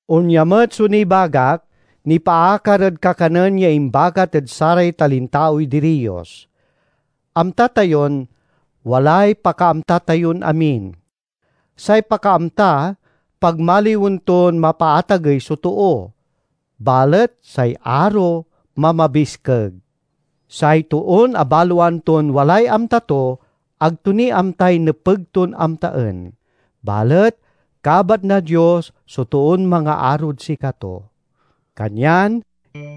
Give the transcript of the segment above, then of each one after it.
Onya met so nibagak, nipaakar ed kakanen ya imbagat ed saray talintaoy diriyos. Amta tayon "walay pakaamta tayon amin." Say pakaamta pagmaliwen ton mapaatagey so too; balet say aro mamabiskeg. Say toon abaloan ton walay amta to, ag to ni amtay nepeg ton amtaen. Balet kabat na Dios so toon mangaarod sikato. Kanyan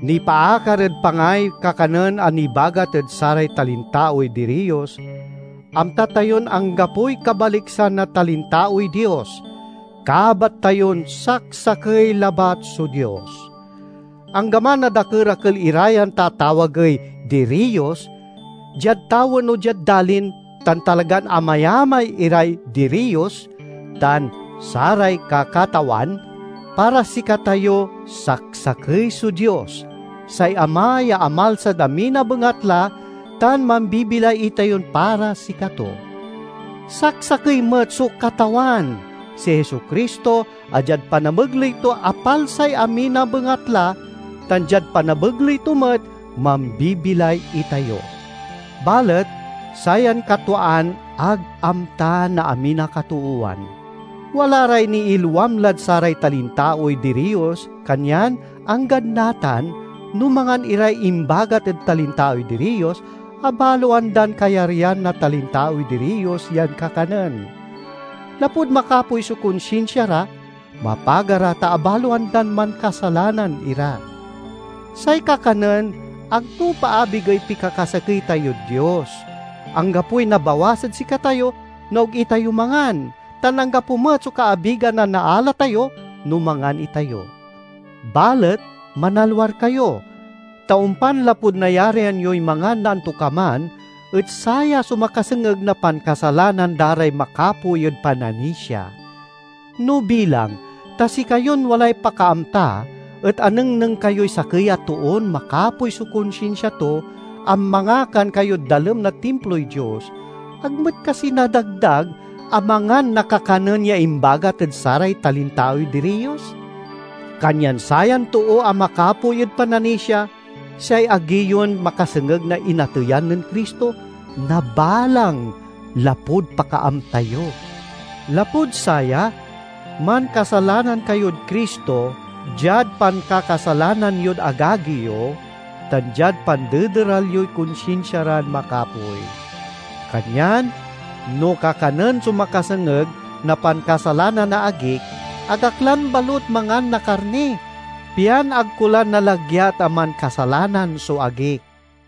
nipaakar ed pangay kakanen a nibagat ed saray talintaoy diriyos: amta tayon anggapoy kabaliksan na talintaoy dios; kabat tayon saksakey labat so Dios. Anggaman a dakerakel ira yan tatawagey "diriyos" diad tawen o diad dalin, tan talagan amayamay "iray diriyos" tan "saray kakatawan," para sikatayo saksakey so Dios, say Ama ya amalsad amin a bengatla tan mambibilay itayon para sikato. Saksakey met so Katawan, si Jesu-Cristo, a diad panamegley to apalsay amin a bengatla, tan diad panamegley to met mambibilay itayo. Balet sayan katwaan ag amta na amin a katoowan. Wala ray niilwam lad saray talintaoy diriyos kanyan, anggad natan, no mangan iray imbagat ed talintaoy diriyos, abaloan dan kayaryan na talintaoy diriyos yan kakanen. Lapud makapoy so konsinsia ra, mapaga ra ta abaloan dan mankasalanan ira. Say kakanen ag to paabigey pikakasakey tayod Dios. Anggapoy nabawas ed sikatayo no ag itayo mangan, tan anggapo met so kaabigan a naala tayo no mangan itayo. Balet manalwar kayo, ta ompan lapud nayarian yoy mangan na antokaman et saya so makasengeg na pankasalanan da ray makapoy ed pananisia. No bilang ta sikayon walay pakaamta et anengneng kayoy sakey a toon makapoy so konsinsia to, a mangakan kayod dalem na timploy dios, ag met kasi nadagdag a mangan na kakanen ya imbagat ed saray talintaoy diriyos? Kanyan sayan too a makapoy ed pananisia, say agi yon makasengeg na inateyan nen Cristo, nabalang lapud "pakaamta" yo! Lapud saya, mankasalanan kayod Cristo, diad pankakasalanan yod agagi yo, tan diad pandederal yoy konsinsia ran makapoy. Kanyan no kakanen so makasengeg na pankasalanan na agik, ag ak lan balut mangan na karni, pian ag ko la nalagyat a mankasalanan so agik.